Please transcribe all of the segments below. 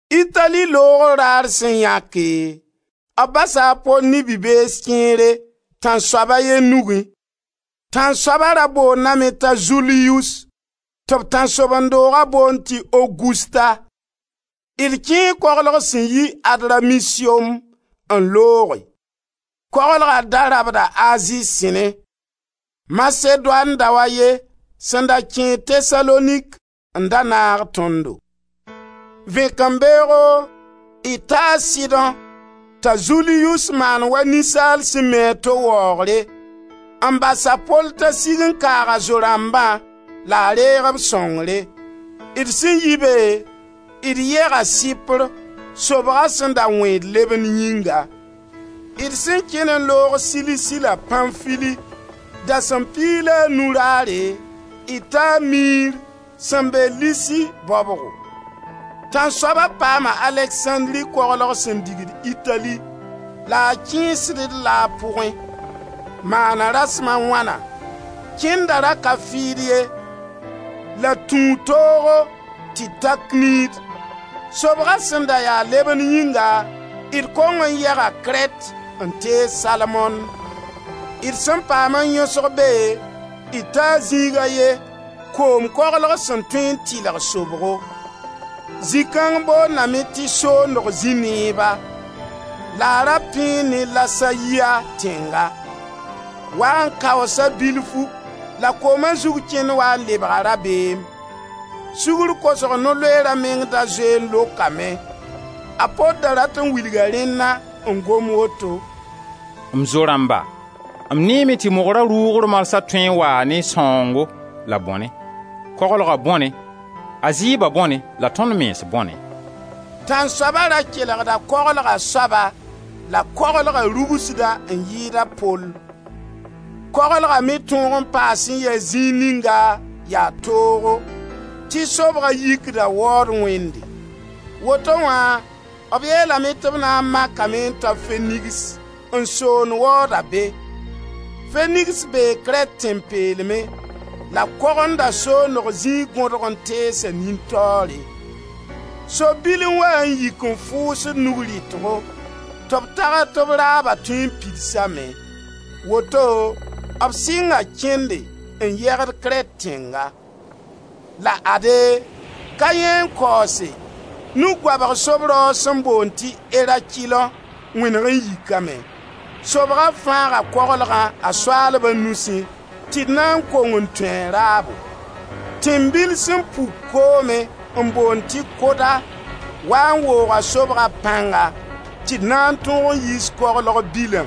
Itali loogr raar sẽn yãke, b basa a Pol ne bi-bees kẽere, tãnsoab a ye nugẽ. Tãnsoaba ra boondame t'a Zuliyus, tɩ b tãnsoben-dooga boond tɩ Ogusta. D kẽe koglg sẽn yi Adramisiom, n looge. Koglga da rabda Azi sẽnẽ. Masedoan dao a ye sẽn da kẽed Tesalonik n da naag tõndo. Vẽkembeoogo d taa Sidõ t'a Zuliyus maan wa ninsaal sẽn mi a to waoogre n bas a Pol t'a sig n kaag a zo-rãmbã la a reeg b sõngre. D sẽn yi be, d yega Sɩpr, sobga sẽn da wẽed lebend yĩnga. D sẽn kẽn n loog Silisi la Pãnfili, dasem piig la a nu raare, d taa Mir sẽn be Lisi baobgo. Tãnsoaba paama Aleksãndri koglg sẽn digd Itali la a kẽesd-d-la a pʋgẽ. Maana rasem a wãna, kẽnda ra ka fɩɩd ye la tũu toogo tɩ d ta Knid. Sobga sẽn da ya lebend yĩnga d kong n yega Krɛt n tees Salmone. D sẽn paam n yõsg be d ta zĩig a ye koom koglg sẽn tõe n tɩlg sobgo. Zĩ-kãng boondame tɩ Soondg zĩ-neeba la a ra pẽe ne Lasayia tẽnga. Waa n kaoosa bilfu la kooma zug kẽnd waa n lebga rabeem. Sugr kosg no-loeera meng da zoe n lokame. A Pol da rat n wilga rẽnna n gom woto: «M zo-rãmba, m neeme tɩ mogra rʋʋgr marsã tõe n waa ne sãoongo la bõne: koglga bõne, a zɩɩba bõne la tõnd mens bõne.» Tãnsoaba ra kelgda koglga soaba la koglga rugsda n yɩɩd a Pol. Koglga me tõog n paa a sẽn yɛs zĩig ninga yaa toogo, tɩ sobga yikda waood wẽnde. Woto wã b yeelame tɩ b na n makame n ta Fenigs n soond waooda be. Fenigs bee Krɛt tẽn-peelmẽ la kogenda soondg zĩig gõdg n teesa nin-taoore. Sob-bil n waa n yik n fʋʋsd nug rɩtgo tɩ b tags tɩ b raaba tõe n pidsame. Woto b sɩnga kẽnde n yegd Krɛt tẽnga. La ade, ka yãee n kaoose, nug goabg sob-raoog sẽn boond ti «Erakilõ» wẽneg n yikame. Sobga fãaga koglgã a soaalba nusẽ tɩ d na n kong n tũ a raabo. Tẽmbil sẽn puk koomẽ n boond tɩ Koda wa n wooga sobga pãnga tɩ d na n tõog n yiis koglg bilã.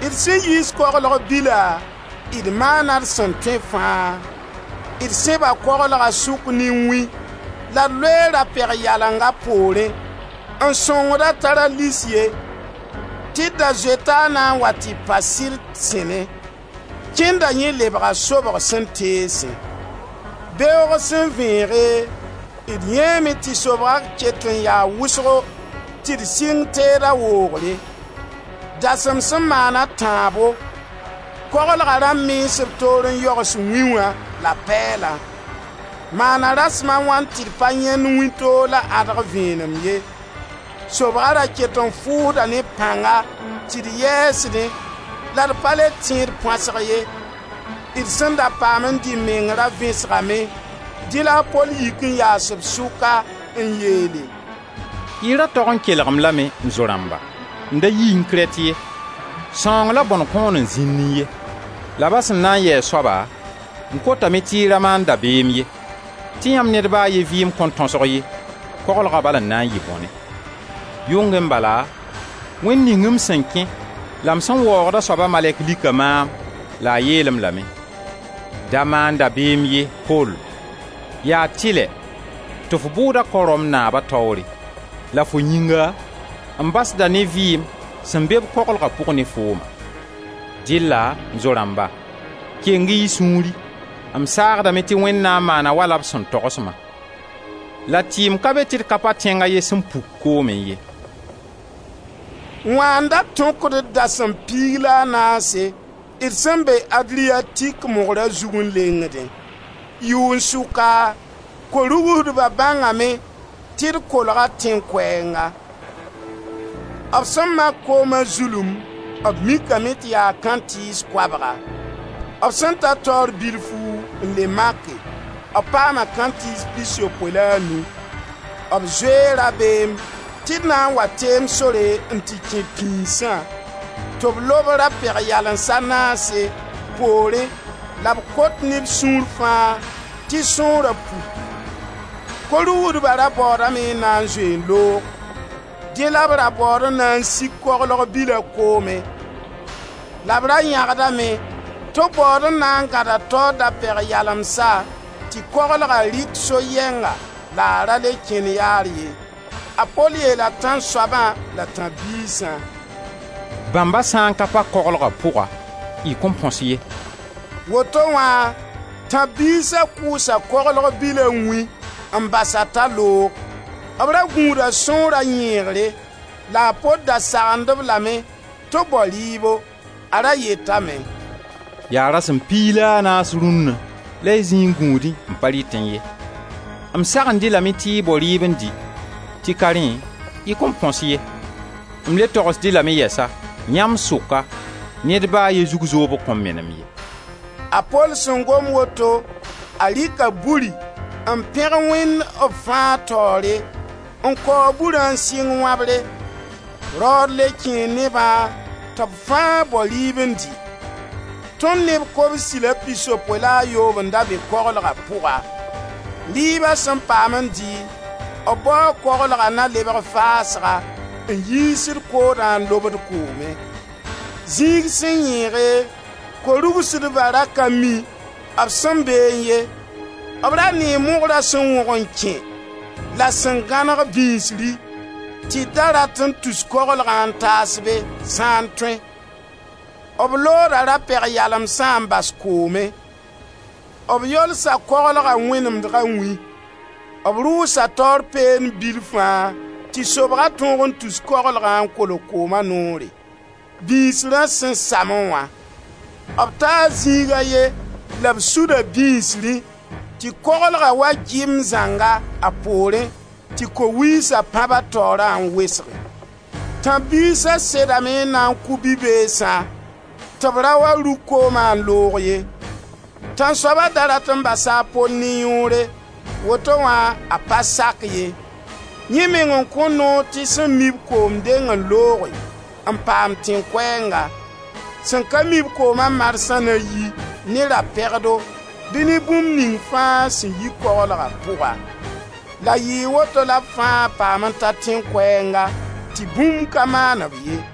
D sẽn yiis koglg bila d maana d sẽn tõe fãa. D sẽba koglga sʋk ne wĩ la d loe ra-peg-yaleng a poorẽ n sõngd-a t'a ra lis ye, tɩ d da zoeta a na n wa tɩ pa Sirt sẽnẽ. Kẽnda yẽ lebga sobg sẽn teesẽ. Beoog sẽn vẽege, d yãeeme tɩ sobga ket n yaa wʋsgo tɩ d sɩng teeda woogre. Dasem sẽn maan a tãabo, koglga rãmb mens b toor n yogs wĩ wã la pɛɛlã. Maana rasem a wãn tɩ b pa yãend wĩntoog la ãdg vẽenem ye. Sobga ra ket n fʋʋsda ne pãnga tɩ d yɛɛsdẽ la d pa le tẽed põasg ye. D sẽn da paam n dɩ meng ra vẽsgame dẽ la a Pol yik n yaas b sʋka n yeele: «Y ra tog n kelg-m lame, m zo-rãmba, n da yiẽ Krɛt ye. Sãong la bõne kõn n zĩnnẽ ye. La ba sẽn na n yɩ a soaba, m kotame tɩ y ra maan dabeem ye, tɩ yãmb ned ba a ye vɩɩm kõn tõsg ye, koglga bal n na n yɩ bõne. Yʋngẽ bala Wẽnd ning m sẽn kẽ la m sẽn waoogd a soaba malɛk lika maam la a yeel-m lame: ‹Da maan dabeem ye, Pol, ya tɩlɛ tɩ f bʋʋda kao Rom naaba taoore la fo yĩnga m basda ne vɩɩm sẽn be-b koglga pʋg ne fooma.› Dɩlla, m zo-rãmba, keng-y y sũuri! M saagdame tɩ Wẽnd na n maana wala b sẽn togs-ma. La tɩɩm ka be tɩ d ka pa tẽng a ye sẽn puk koomẽ ye.» Wã n da tõkd d dasem piig la a naase, d sẽn be Adriatik mogra zug n lengdẽ. Yʋn-sʋka, ko-rugsdba bãngame tɩ d kolga tẽn koɛɛnga. B sẽn mak kooma zulum b mikame tɩ yaa kãntɩɩs koabga; b sẽn ta taoor bilfu n le make, b paama kãntɩɩs pisopoe la a nu. B zoe rabeem tɩ d na n wa teem sore n tɩ kẽ pĩisã, tɩ b lob ra-peg-yalens a naase, poorẽ, la b kot ne b sũur fãa, tɩ sõora puki. Ko-rugsdba ra baoodame n na n zoe n loog. Dẽ la b ra baood n na n sik koglg bila koomẽ la b ra yagdame tɩ baood n na n gãda taoor da-peg-yalemsa tɩ koglga rɩk so-yɛnga la a ra le kẽn yaar ye. A Pol yeela tãnsoabã la tãb-biisã: «Bãmba sã n ka pa koglga pʋga, y kõn põs ye.» Woto wã tãb-biisa kʋʋsa koglg bila wĩ n bas-a t'a loog. B ra gũuda sõora yẽegre la a Pol da sagend-b lame tɩ b bao rɩɩbo. A ra yetame: «Yaa rasem piig la a naas rũnna la y zĩi n gũudẽ, n pa rɩtẽ ye. M sagend-y lame tɩ y bao rɩɩb n dɩ, tɩ ka rẽ y kõn põs ye. M le togsd-y lame yɛsa, yãmb sʋka, ned ba a ye zug zoobg kõn menem ye.» A Pol sẽn gom woto, a rɩka buri, n pẽg Wẽnd b fãa taoore, n kaoog burã n sɩng wãbre. Raood le kẽe nebã tɩ b fãa bao rɩɩb n dɩ. Tõnd neb kobsi la pisopoe la a yoob n da be koglga pʋga. Rɩɩba sẽn paam n dɩ, b bao koglga na lebg faasga n yiisd koodã n lobd koomẽ. Zĩig sẽn yẽege, ko-rugsdba ra ka mi b sẽn beẽ ye. B ra nee mogra sẽn wõg n kẽ la sẽn gãneg bĩsri tɩ d da rat n tus koglgã n taas be, sã n tõe. B looda ra-peg-yalemsã n bas koomẽ. B yolsa koglga wẽnemdega wĩ; b rʋʋsa taoor peend bilfã tɩ sobga tõog n tus koglgã n kolg kooma noorẽ, bĩsrã sẽn samẽ wã. B taa zĩig a ye la b suda bĩisrẽ tɩ koglga wa gimb zãnga, a poorẽ, tɩ ko-wiisa pãb a taoorã n wesge. Tãb-biisa sedame n na n kʋ bi-beesã tɩ b ra wa rug kooma n loog ye. Tãnsoaba da rat n basa a Pol ne yõore, woto wã, a pa sak ye. Yẽ meng n kõ noor tɩ sẽn mi-b koom deng n looge n paam tẽn-koɛɛnga. Sẽn ka mi-b kooma marsã na yi ne ra-pegdo bɩ ne bũmb ning fãa sẽn yi koglga pʋga. La yɩɩ woto la b fãa paam n ta tẽn-koɛɛnga tɩ bũmb ka maan-b ye.